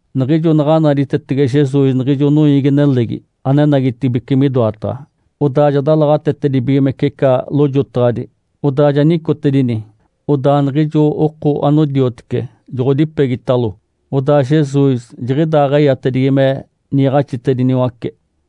Niɡ̶ijo naɡ̶a naditetege Jesus niɡ̶ijo noiigi-nelegi anenagitibeci midoataɡ̶a, odaa ja dalaɡ̶atetedibigimece ica lojotaɡ̶adi, odaa ja nicotedini. Odaa niɡ̶ijo oko anodiotece joɡ̶odipegitalo. Odaa Jesus jiɡ̶idaaɡ̶eyatedigi me niiɡ̶axinaɡ̶atediniwace.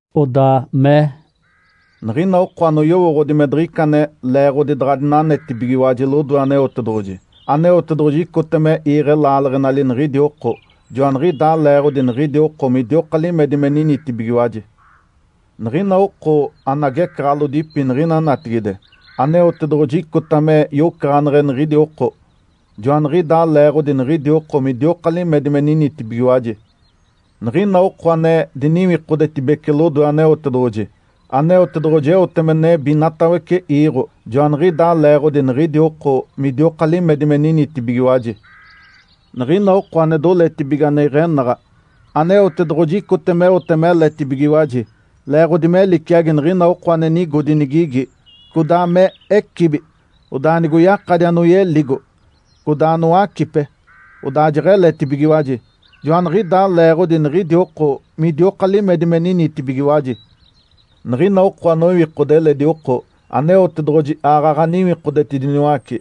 Odaa mee, “Niɡ̶ina oko anoyowooɡ̶odi me diɡ̶ica ane leeɡ̶odi daɡ̶a dinanetibigiwaji lodoe Aneotedoɡ̶oji, Aneotedoɡ̶oji icota me iiɡ̶e laaleɡ̶enali niɡ̶idi oko, joaniɡ̶idaa leeɡ̶odi niɡ̶idi oko midioka limedi me ninitibigiwaji. Niɡ̶ina oko ane agecaɡ̶alodipi niɡ̶ina natigide, Aneotedoɡ̶oji icota me yocaɡ̶aneɡ̶e niɡ̶idi oko, joaniɡ̶idaa leeɡ̶odi niɡ̶idi oko midioka limedi me ninitibigiwaji. Niɡ̶ina oko ane diniwikodetibece lodoe Aneotedoɡ̶oji, Aneotedoɡ̶oji eote me nebi inatawece iiɡ̶o, joaniɡ̶idaa leeɡ̶odi niɡ̶idi oko midioka limedi me ninitibigiwaji. Niɡ̶ina oko ane doletibige ane iɡ̶enaɡ̶a, Aneotedoɡ̶oji icota meote meletibigiwaji, leeɡ̶odi me liciagi niɡ̶ina oko ane nigodi nigigi, codaa me ecibi. Odaa nigoyakadi anoyeligo, codaa anowacipe, odaa jeɡ̶eletibigiwaji. Joaniɡ̶idaa leeɡ̶odi niɡ̶idi oko midioka limedi me ninitibigiwaji. Niɡ̶ina oko anoiwikode eledi oko, Aneotedoɡ̶oji aaɡ̶aɡ̶a niwikodetediniwace,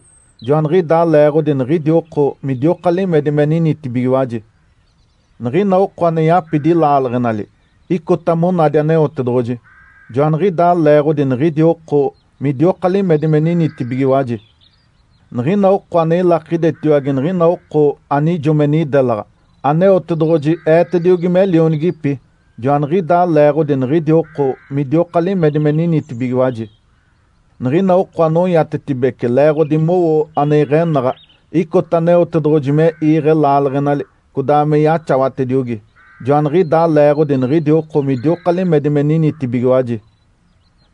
joaniɡ̶idaa leeɡ̶odi niɡ̶idi oko midioka limedi me ninitibigiwaji. Niɡ̶ina oko ane yapidi laaleɡ̶enali, icota monadi Aneotedoɡ̶oji. Joaniɡ̶idaa leeɡ̶odi niɡ̶idi oko midioka limedi me ninitibigiwaji. Niɡ̶ina oko ane ilakidetaciwage niɡ̶ina oko anijo me nidelaɡ̶a, Aneotedoɡ̶oji eetediogi me lionigipi. Joaniɡ̶idaa leeɡ̶odi niɡ̶idi oko midioka limedi me ninitibigiwaji. Niɡ̶ina oko anoiatetibece leeɡ̶odi mowo ane iɡ̶enaɡ̶a, icota Aneotedoɡ̶oji me iiɡ̶e laaleɡ̶enali codaa me yaxawatediogi. Joaniɡ̶idaa leeɡ̶odi niɡ̶idi oko midioka limedi me ninitibigiwaji.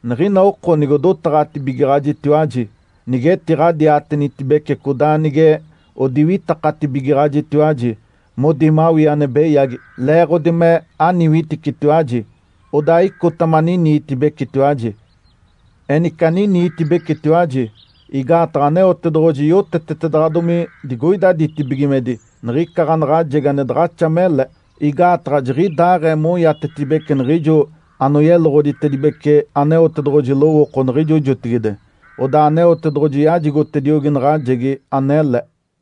Niɡ̶ina oko nigodotaɡ̶atibigaɡ̶ajitiwaji, nige etiɡ̶adiatenitibece codaa nige odiwitakatibigaɡ̶ajitiwaji, modi mawii ane beyagi, leeɡ̶odi me aniwiticitiwaji, odaa icota maniniitibecitiwaji. Enice aniniitibecitiwaji, igaataɡ̶a Aneotedoɡ̶oji yotetetedaɡ̶adomi digoida ditibigimedi niɡ̶ica ɡ̶anaɡ̶ajegi ane daɡ̶axa mele. Igaataɡ̶a jiɡ̶idaaɡ̶ee moiatetibeci niɡ̶ijo anoyeloɡ̶oditedibece Aneotedoɡ̶oji lowooko niɡ̶ijo jotigide. (Odaa Aneotedoɡ̶oji yajigotediogi naɡ̶ajegi anele.)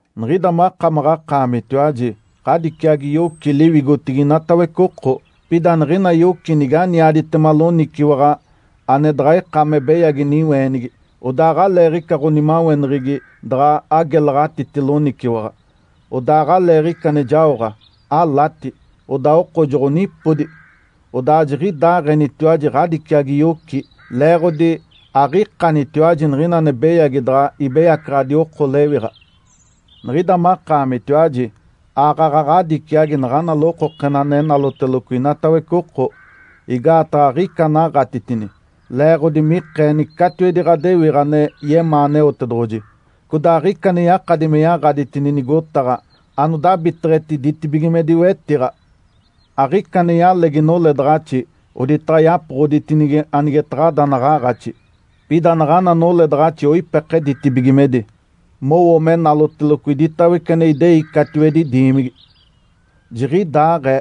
Niɡ̶ida makamaɡ̶akaamitiwaji ɡ̶adiciagi yoci liwigotigi inatawece oko. Pida niɡ̶ina yoci nige aniaditema loniciwaɡ̶a ane daɡ̶a ika me beyagi niweenigi, odaa aɡ̶aleeɡ̶ica ɡ̶onimaweneɡ̶egi daɡ̶a agelaɡ̶atiti loniciwaɡ̶a. Odaa aɡ̶aleeɡ̶ica ane jaoɡ̶a, alati, odaa oko joɡ̶onipodi. (Odaa jiɡ̶idaaɡ̶enitiwaji ɡ̶adiciagi yoci, leeɡ̶odi aɡ̶ikanitiwaji niɡ̶ina ane beyagi daɡ̶a ibeyacaɡ̶adi oko lewiɡ̶a.) Niɡ̶ida makaamitiwaji aaɡ̶aɡ̶a ɡ̶adiciagi naɡ̶ana lokokena ane naloteloco inatawece oko, igaataɡ̶a aɡ̶ica anaɡ̶atitini, leeɡ̶odi mikeeni catiwedi ɡ̶adewiɡ̶a ane yemaa Aneotedoɡ̶oji. Codaa aɡ̶ica ane yakadi me yaɡ̶aditini nigotaɡ̶a anodabiteɡ̶eti ditibigimedi wetiɡ̶a. Aɡ̶ica ane yalegi noledaɡ̶axi, oditaɡ̶a yapoɡ̶oditinigi anigetaɡ̶ada naɡ̶aaɡ̶axi. Pida naɡ̶ana noledaɡ̶axi oipeke ditibigimedi, mowo me naloteloco iditawece ane idei catiwedi diimigi. Jiɡ̶idaaɡ̶ee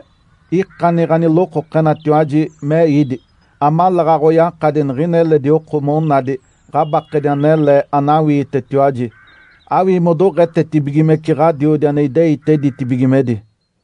ikani ɡ̶anilokokenatiwaji me ídi, amaleeɡ̶aɡ̶a oyakadi niɡ̶ina eledi oko monadi ɡ̶abakedi anele anawiitetiwaji, awii modoɡ̶etetibigimece Ǥadiodi ane ideite ditibigimedi.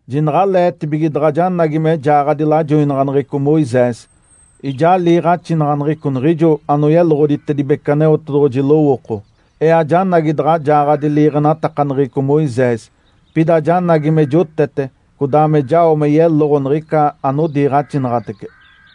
Jinaɡ̶aleetibige daɡ̶a janagi me jaaɡ̶adi lajoinaɡ̶aneɡ̶eco Moisés, ijaa liiɡ̶axinaɡ̶aneɡ̶eco niɡ̶ijo anoyeloɡ̶oditedibece Aneotedoɡ̶oji lowooko. Ee ajanagi daɡ̶a jaaɡ̶adi liiɡ̶enatakaneɡ̶eco Moisés, pida janagi me jotete codaa me jao me yeloɡ̶o niɡ̶ica anodiiɡ̶axinaɡ̶atece.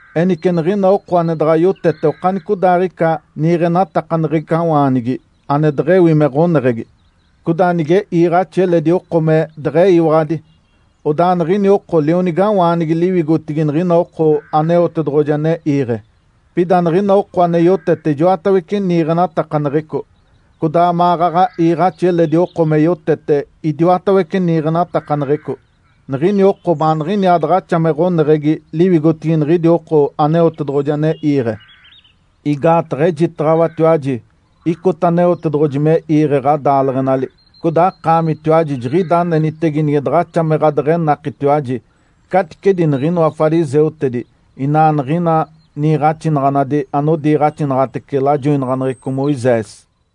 Enice niɡ̶ina oko ane daɡ̶a yotete okanicodaaɡ̶ica niiɡ̶enatakaneɡ̶ecawaanigi ane deɡ̶ewi me ɡ̶oneɡ̶egi, codaa nige iiɡ̶axi eledi oko me deɡ̶eyiwaɡ̶adi, odaa niɡ̶ini oko lionigawaanigi liwigotigi niɡ̶ina oko Aneotedoɡ̶oji ane iiɡ̶e. Pida niɡ̶ina oko ane yotete ijoatawece niiɡ̶enatakaneɡ̶eco, codaa maɡ̶aɡ̶a iiɡ̶axi eledi oko me yotete idiwatawece niiɡ̶enatakaneɡ̶eco, niɡ̶ini oko baaniɡ̶iniaa daɡ̶axa me ɡ̶oneɡ̶egi liwigotigi niɡ̶idi oko Aneotedoɡ̶oji ane iiɡ̶e. Igaataɡ̶a ejitaɡ̶awatiwaji icota Aneotedoɡ̶oji me iiɡ̶e ɡ̶adaaleɡ̶enali, codaa akaamitiwaji jiɡ̶ida anenitege nige daɡ̶axa me ɡ̶adeɡ̶enakitiwaji caticedi niɡ̶inoa fariseutedi inaa niɡ̶ina niiɡ̶axinaɡ̶anadi anodiiɡ̶axinaɡ̶atece lajoinaɡ̶aneɡ̶eco Moisés.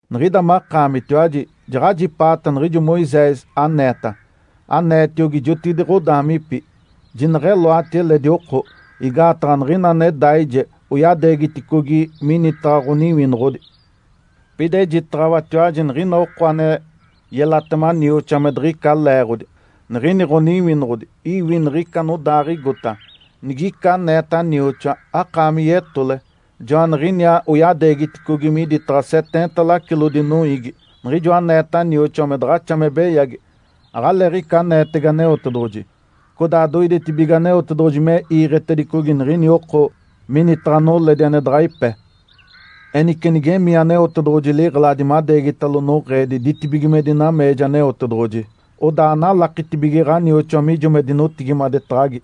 Niɡ̶ida makaamitiwaji jaɡ̶ajipaata niɡ̶ijo Moisés aneeta, aneetiogi jotigide ɡ̶adaamipi, ‘Jineɡ̶eloati eledi oko! Igaataɡ̶a niɡ̶ina ane daije oyadeegiticogi minitaɡ̶a ɡ̶oniwinoɡ̶odi.’ Pida ejitaɡ̶awatiwaji niɡ̶ina oko ane yelatema nioxoa me diɡ̶ica leeɡ̶odi, niɡ̶ini ɡ̶oniwinoɡ̶odi iwi niɡ̶ica anodaaɡ̶igota. Nigica aneeta nioxoa, ‘Akaami yetole!’ Joaniɡ̶iniaa oyadeegiticogi miditaɡ̶a seteenta lacilodi noiigi. Niɡ̶ijo aneeta nioxoa me daɡ̶axa me beyagi, aɡ̶aleeɡ̶ica aneetege Aneotedoɡ̶oji, codaa doidetibige Aneotedoɡ̶oji me iiɡ̶etedicogi niɡ̶ini oko minitaɡ̶a noledi ane daɡ̶a ipe. Enice nige emii Aneotedoɡ̶oji liɡ̶eladi madeegitalo noɡ̶eedi ditibigimedi nameeja Aneotedoɡ̶oji, odaa analakitibige ɡ̶anioxoa mijo me dinotigimadetaɡ̶agi.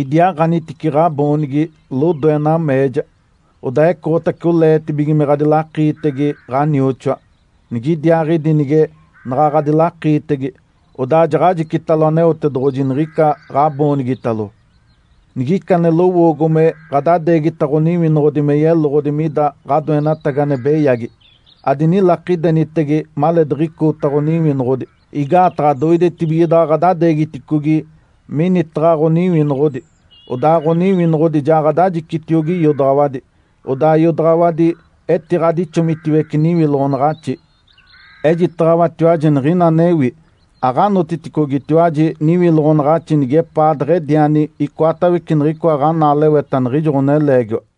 Idiaaɡ̶anitice ɡ̶aboonigi lodoe nameeja. Odaa ecoɡ̶otace oleetibige me ɡ̶adilakiitege ɡ̶anioxoa, nigidiaaɡ̶idi nige naɡ̶a ɡ̶adilakiitege, odaa jaɡ̶ajicitalo Aneotedoɡ̶oji niɡ̶ica ɡ̶aboonigitalo. Nigica ane lowoogo me ɡ̶adadeegita ɡ̶oniwinoɡ̶odi me yeloɡ̶odi mida ɡ̶adoenatagi ane beyagi, adinilakidenitege maleediɡ̶icoota ɡ̶oniwinoɡ̶odi. Igaataɡ̶a doidetibige daɡ̶a ɡ̶adadeegiticogi minitaɡ̶a ɡ̶oniwinoɡ̶odi, odaa ɡ̶oniwinoɡ̶odi ja ɡ̶adajicitiogi iodaɡ̶awadi. Odaa iodaɡ̶awadi etiɡ̶adixomitiwece niwiloɡ̶onaɡ̶axi. Ejitaɡ̶awatiwaji niɡ̶ina anewi. Aɡ̶anotiticogitiwaji niwiloɡ̶onaɡ̶axi nigepaaɡ̶ediani icoatawece niɡ̶icoa ɡ̶anaaleweta niɡ̶ijo ɡ̶oneleegiwa.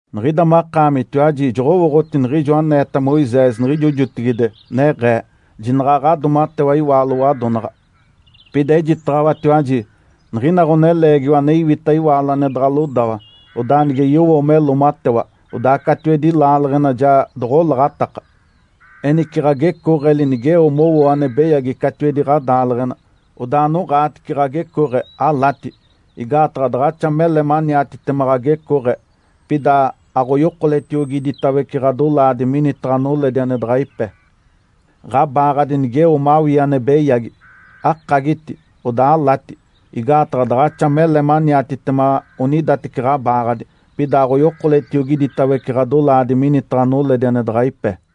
Niɡ̶ida makaamitiwaji joɡ̶owooɡ̶oti niɡ̶ijo aneeta Moisés niɡ̶ijo jotigide, neɡ̶ee, ‘Jinaɡ̶a ɡ̶adoomatewa iwaalo wadonaɡ̶a.’ Pida ejitaɡ̶awatiwaji, niɡ̶ina ɡ̶oneleegiwa ane iwita iwaalo ane daɡ̶a lodawa, odaa nige yowo me loomatewa, odaa catiwedi laaleɡ̶ena ja doɡ̶olaɡ̶ataka. Enice ɡ̶agecooɡ̶eli nigeo mowoo ane beyagi catiwedi ɡ̶adaaleɡ̶ena, odaa anoɡ̶aatice ɡ̶agecooɡ̶e, alati! Igaataɡ̶a daɡ̶axa mele maniatitema ɡ̶agecooɡ̶e, pida aɡ̶oyokoletiogi iditawece ɡ̶adolaadi minitaɡ̶a noledi ane daɡ̶a ipe. Ǥabaaɡ̶adi nigeo mawii ane beyagi, akagiti, odaa alati. Igaataɡ̶a daɡ̶axa mele maniatitema onidateci ɡ̶abaaɡ̶adi, pida aɡ̶oyokoletiogi iditawece ɡ̶adolaadi minitaɡ̶a noledi ane daɡ̶a ipe.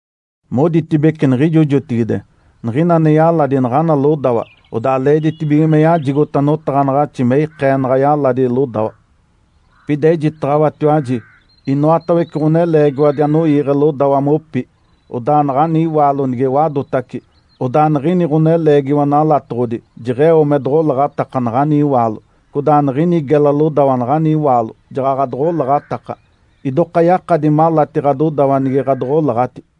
Moditibece niɡ̶ijo jotigide, ‘Niɡ̶ina ane yaladi naɡ̶ana lodawa, odaa leeditibige me yajigota notaɡ̶anaɡ̶axi me ikee naɡ̶a yaladi lodawa.’ Pida ejitaɡ̶awatiwaji, inoatawece ɡ̶oneleegiwadi anoiiɡ̶e lodawa mopi, odaa naɡ̶ani iwaalo nige wadotace, odaa niɡ̶ini ɡ̶oneleegiwa nalatoɡ̶odi jeɡ̶eo me doɡ̶olaɡ̶ataka naɡ̶ani iwaalo. Codaa niɡ̶ini gela lodawa naɡ̶ani iwaalo jaɡ̶aɡ̶a doɡ̶olaɡ̶ataka. Idoka yakadi malati ɡ̶adodawa nige ɡ̶adoɡ̶olaɡ̶ati.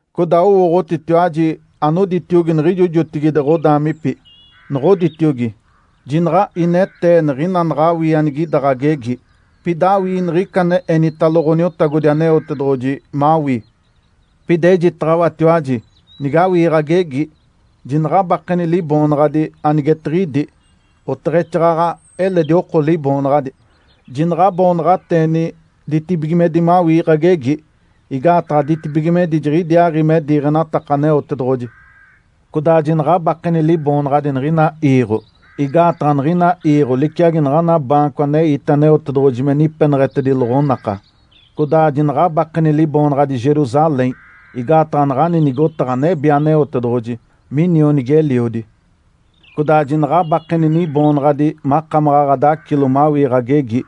Codaa owooɡ̶otitiwaji anoditiogi niɡ̶ijo jotigide ɡ̶odaamipi, noɡ̶oditiogi, ‘Jinaɡ̶a inetee niɡ̶ina naɡ̶awii anigida ɡ̶agegi, pida awii niɡ̶ica ane enitalo Ǥoniotagodi Aneotedoɡ̶oji mawii.’ Pida ejitaɡ̶awatiwaji, nigawii ɡ̶agegi, jinaɡ̶abakeni liboonaɡ̶adi anigetiɡ̶idi, oteɡ̶exaaɡ̶aɡ̶a eledi oko liboonaɡ̶adi. Jinaɡ̶a aboonaɡ̶ateeni ditibigimedi mawii ɡ̶agegi, igaataɡ̶a ditibigimedi jiɡ̶idiaaɡ̶i me diiɡ̶enataka Aneotedoɡ̶oji. Codaa jinaɡ̶abakeni liboonaɡ̶adi niɡ̶ina iiɡ̶o, igaataɡ̶a niɡ̶ina iiɡ̶o liciagi naɡ̶ana baanco aneite Aneotedoɡ̶oji me nipeneɡ̶etedini loɡ̶onaka. Codaa jinaɡ̶abakeni liboonaɡ̶adi Jerusalém, igaataɡ̶a naɡ̶ani nigotaɡ̶a nebi Aneotedoɡ̶oji, minionigi-eliodi. Codaa jinaɡ̶abakeni niboonaɡ̶adi makamaɡ̶a ɡ̶adacilo mawii ɡ̶agegi,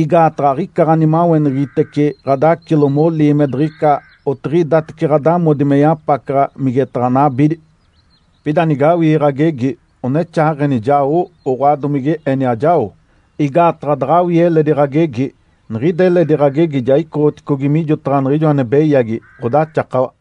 igaataɡ̶a aɡ̶ica ɡ̶animaweneɡ̶egitece ɡ̶adacilo molii me diɡ̶ica otiɡ̶idatece ɡ̶adamodi me yapacaɡ̶a migetaɡ̶a nabidi. Pida nigawii ɡ̶agegi, onexaaɡ̶eni, ‘Jao’, oɡ̶oa domige eni, ‘Ajao’, igaataɡ̶a daɡ̶awii eledi ɡ̶agegi, niɡ̶ida eledi ɡ̶agegi ja icoɡ̶oticogi mijotaɡ̶a niɡ̶ijo ane beyagi, ɡ̶odaxakawa.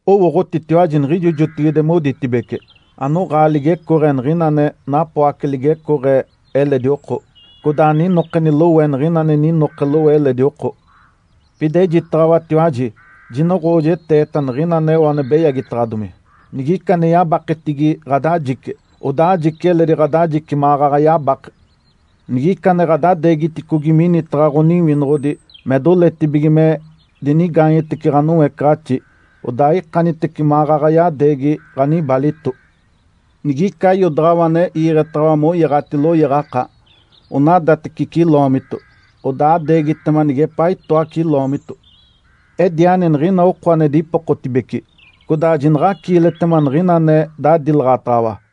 Owooɡ̶otitiwaji niɡ̶ijo jotigide moditibece, ‘Anoɡ̶aa ligecooɡ̶e niɡ̶ina ane napoace ligecooɡ̶e eledi oko. Codaa aninokeni lowe niɡ̶ina ane ninoke lowe eledi oko.’ Pida ejitaɡ̶awatiwaji jinoɡ̶oojeteeta niɡ̶ina aneo ane beyagitaɡ̶adomi. Nigica ane yabaketigi ɡ̶adajice, odaa ajici eledi ɡ̶adajice maɡ̶aɡ̶a yabake. Nigica ane ɡ̶adadeegiticogi minitaɡ̶a ɡ̶oniwinoɡ̶odi me doletibige me dinigaanyetece ɡ̶anoecaɡ̶axi, odaa ikanitece maɡ̶aɡ̶a yadeegi ɡ̶anibalito. Nigica iodaɡ̶awa ane iiɡ̶etaɡ̶awa moyaɡ̶ati loyaɡ̶aka onadateci ciloomito, odaa adeegitema nigepaa itoa ciloomito. Ediani niɡ̶ina oko ane dipokotibece, codaa jinaɡ̶aciiletema niɡ̶ina ane dadilaɡ̶ataɡ̶awa.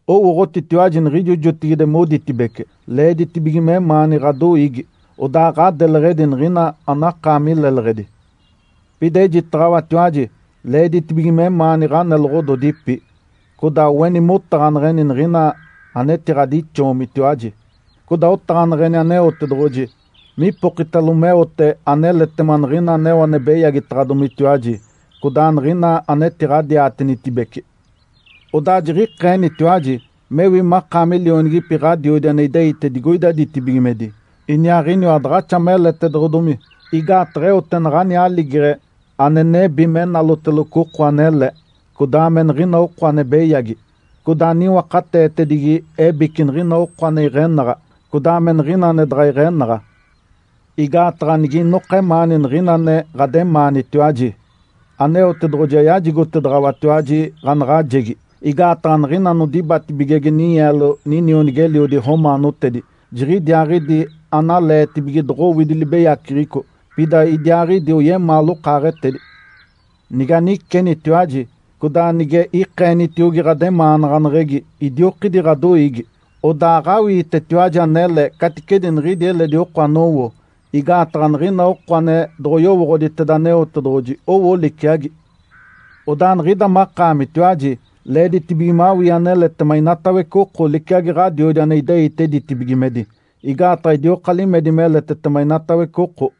Owooɡ̶otitiwaji niɡ̶ijo jotigide moditibece, ‘Leeditibige memaani ɡ̶adoiigi, odaa ɡ̶adeleɡ̶edi niɡ̶ina anakaami leleɡ̶edi.’ Pida ejitaɡ̶awatiwaji leeditibige memaani ɡ̶aneloɡ̶ododipi. Codaa oeni motaɡ̶aneɡ̶eni niɡ̶ina anetiɡ̶adixoomitiwaji. Codaa otaɡ̶aneɡ̶eni Aneotedoɡ̶oji mipokitalo meote aneletema niɡ̶ina aneo ane beyagitaɡ̶adomitiwaji codaa niɡ̶ina anetiɡ̶adiatenitibece. Odaa jiɡ̶ikeenitiwaji mewi makaami lionigipi Ǥadiodi ane ideite digoida ditibigimedi. Iniaaɡ̶iniwa daɡ̶axa meletedoɡ̶odomi, igaataɡ̶a eote naɡ̶ani aligeɡ̶e ane nebi me naloteloco oko anele, codaa me niɡ̶ina oko ane beyagi. Codaa niwakateetedigi ebici niɡ̶ina oko ane iɡ̶enaɡ̶a, codaa me niɡ̶ina ane daɡ̶a iɡ̶enaɡ̶a. Igaataɡ̶a nige inoka emaani niɡ̶ina ane ɡ̶ademaanitiwaji, Aneotedoɡ̶oji ayajigotedaɡ̶awatiwaji ɡ̶anaɡ̶ajegi, igaataɡ̶a niɡ̶ina anodibatibigege ninyeelo ninionigi-eliodi romaanotedi, jiɡ̶idiaaɡ̶idi analeetibige doɡ̶owidi libeyaceɡ̶eco, pida idiaaɡ̶idi oyemaa lokaaɡ̶etedi. Nige anicenitiwaji codaa nige ikeenitiogi ɡ̶ademaanaɡ̶aneɡ̶egi idiokidi ɡ̶adoiigi, odaa aɡ̶awiitetiwaji anele caticedi niɡ̶idi eledi oko anowo, igaataɡ̶a niɡ̶ina oko ane doɡ̶oyowooɡ̶oditeda Aneotedoɡ̶oji owo liciagi. Odaa niɡ̶ida makaamitiwaji leeditibige mawii aneletema inatawece oko liciagi Ǥadiodi ane ideite ditibigimedi, igaataɡ̶a idioka limedi meletetema inatawece oko.”